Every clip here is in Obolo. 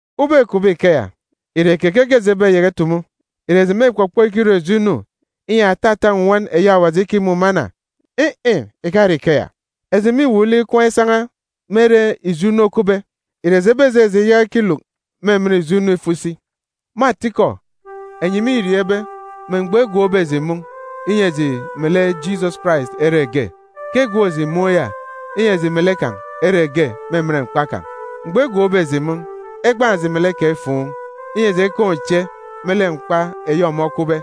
Ubọk îkupbe ikeya, ìre keke ke eji ebeyaka itumu? Ìre eji mêkpọkpọ ikirọ ijo inu, inyi atata nnwọn eyi Awaji ikimumana? In̄-in̄, ìkare ikeya! Eji mîwuuk lek ikwaan̄ isan̄a me ere ijo inu okupbe. Ìre eji ebejeje iyaka ikiluk me emen ijo inu ifo isi? Me atikọ, enyi mîriọọn̄ ibe, me mgbọ egwookbe eji mun̄, inyi eji melek Jisọs Karais ere ge, ke egwook eji mun̄ ya, inyi eji melek kan̄ ere ge me emen mkpa kan̄. Mgbọ egwookbe eji mun̄, egbaan̄ eji melek kan̄ ifuun̄, inyi eji ekaan̄ uche me lek mkpa eyi ọmọ okwube.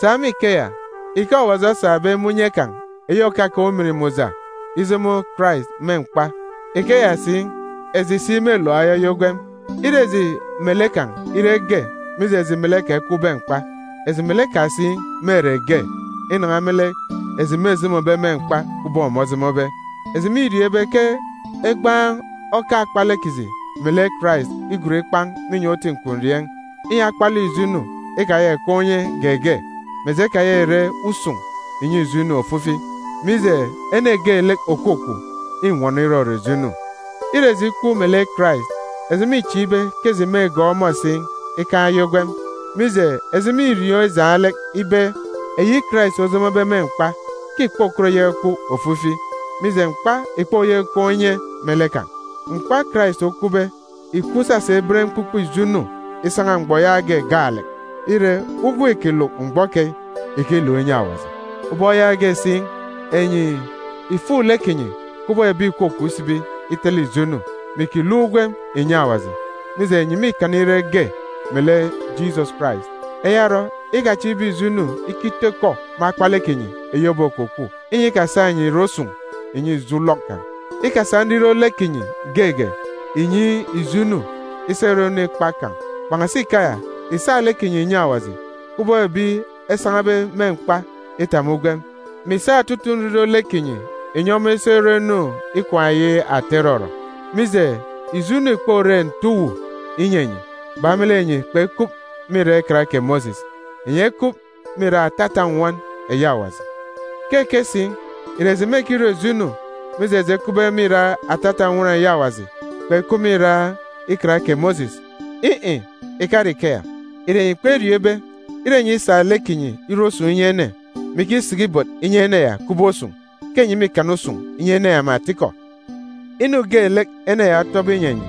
Sa me ikeya, ike Awaji osabe me unye kan̄ eyi òkakaan̄ ujamgbugbo ijomo Karais me mkpa, ikeya si, eji si mêluk ayaya ugwem. Ire eji melek kan̄ ire ge mije eji melek kan̄ ekwube mkpa, eji melek kan̄ si mêre ge inan̄a me lek eji mêjomobe me mkpa kubọk ọmọ ojomobe. Eji mîriọọn̄ ibe ke egbaan̄ oka akpalek kiji melek Karais igon ikpan̄ me inyọn̄ uti nkwurieen̄, inyi akpalek ijo inu ikayaka ìkaan̄ unye geege, mè eji ekayaka ìre usun̄ ìnyi ijo inu ofifi, mije, ene geelek òkwukwu, înwọnọ irọrọ ijo inu. Ire eji ikwu melek Karais, eji mîchieek ibe ke eji mêgọọk ọmọ si ikaan̄ aya ugwem. Mije, eji mîriọọn̄ ijaan̄ lek ibe, eyi Karais ojomobe me mkpa, ke ìkpokọt iyaka ikwu ofifi, mije, mkpa ìkpoyaka ikaan̄ unye me lek kan̄. Mkpa Karais okwube, ìkwu isasa iben mkpukpe ijo inu isan̄a mgbọ yaage gaalek. Ire, ugwem îkiluk mgbọ keyi, ìkiluk inyi Awaji. Ubọk yaage si, enyi ìfuk lek kinyi kubọk ebi ìkwakwaan̄ isibi itele ijo inu, mè ìkiluk ugwem ìnyi Awaji, mije, enyi mîkana ire ge melek Jisọs Karais. Eya orọ, ikachieek ibe ijo inu ikitọ ikọ me akpalek kinyi eyi òbokwukwu, inyi ikasa enyi ìrọ usun̄ ìnyi ijo ulọk kan̄. Ikasa nriro lek kinyi geege ìnyi ijo inu isa irọ inu ikpak kan̄. Kpan̄asi ikeya, ìsa lek kinyi ìnyi Awaji, kubọk ebi esan̄abe me mkpa itap me ugwem, mè ìsa otutuuk nriro lek kinyi ìnyi ọmọ isa irọ nroon̄ ikwaan̄ eyi ata irọrọ. Mije, ijo inu ìkpore nte uwu inyi enyi, bak me lek enyi kpekup me irak Ikan kè Mosis, enyi ekup me irak atata nnwọn eyi Awaji. Keke si? Ìre eji mêkirọ ijo inu, mije eji ekupbe me irak atata nnwọn eyi Awaji, kpekup me irak Ikan kè Mosis? In̄-in̄, ìkare ikeya! Ìre enyi kperiọọn̄ ibe, ire enyi isa lek kinyi irọ usun̄ inyi ene, mè ikisiki ibot inyi ene ya kubọk usun̄, ke enyi mîkana usun̄ inyi ene ya me atikọ? Inu geelek ene ya otọbe inyi enyi,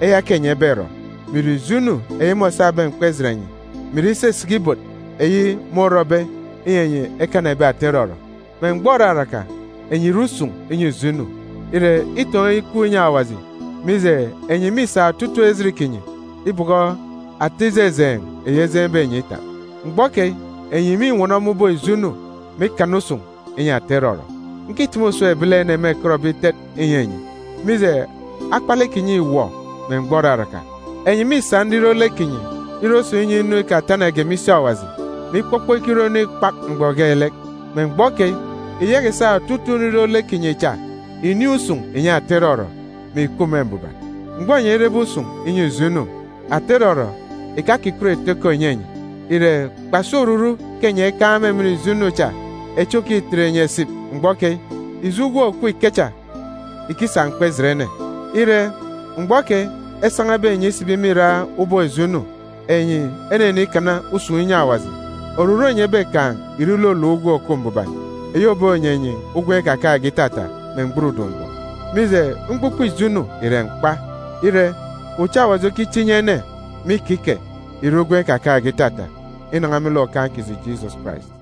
eya ke enyi eberọ, mè ìre ijo inu eyi môsabe mkpa ijet enyi, mè ìre isisiki ibot eyi môrọbe inyi enyi ekana ebi ata irọrọ. Me mgbọ òraraka, enyi ìre usun̄ inyi ijo inu. Ire, itọn̄ ikup inyi Awaji, mije, enyi mîsa otutuuk ejit kinyi ibọkọ ata ijejeen̄ eyi ejeen̄be enyi itap. Mgbọ keyi enyi mînwọnọ me ubọk ijo inu, mè ikana usun̄ inyi ata irọrọ. Ǹkitumu usem ebilene mêkọtbe itet inyi enyi, mije, akpalek kinyi îwọ me mgbọ òraraka. Enyi mîsa nriro lek kinyi irọ usun̄ inyi inu ikatanage me isi Awaji, mè ikpọkpọ ikirọ inu ikpak mgbọ geelek. Me mgbọ keyi, ìyaka ìsa otutuuk nriro lek kinyi cha ìnin̄ usun̄ ìnyi ata irọrọ, mè ìkup me mbuban. Mgbọ enyi erebe usun̄ inyi ijo inu, ata irọrọ ìkakikọt ìtọ ikọ ìnyi enyi. Ìre kpasi oruru ke enyi ekaan̄ me emen ijo inu cha echi òkitet enyi esip mgbọ keyi? Ijo ugwem òkup ikecha ìkisa mkpa ijet ene. Ire, mgbọ keyi esan̄abe enyi isibi me irak ubọk ijo inu, enyi enenikana usun̄ inyi Awaji, oruru enyi ebekaan̄ ìre iluluk ugwem òkup mbuban, eyi òbonyi enyi ugwem ikakaan̄ge itata me mgburudun̄ mgbọ. Mije, mkpukpe ijo inu ìre mkpa. Ire, uche Awaji okiche inyi ene me ikike ìre ugwem ikakaan̄ge itata, inan̄a me lek Okaan̄ kiji Jisọs Karais.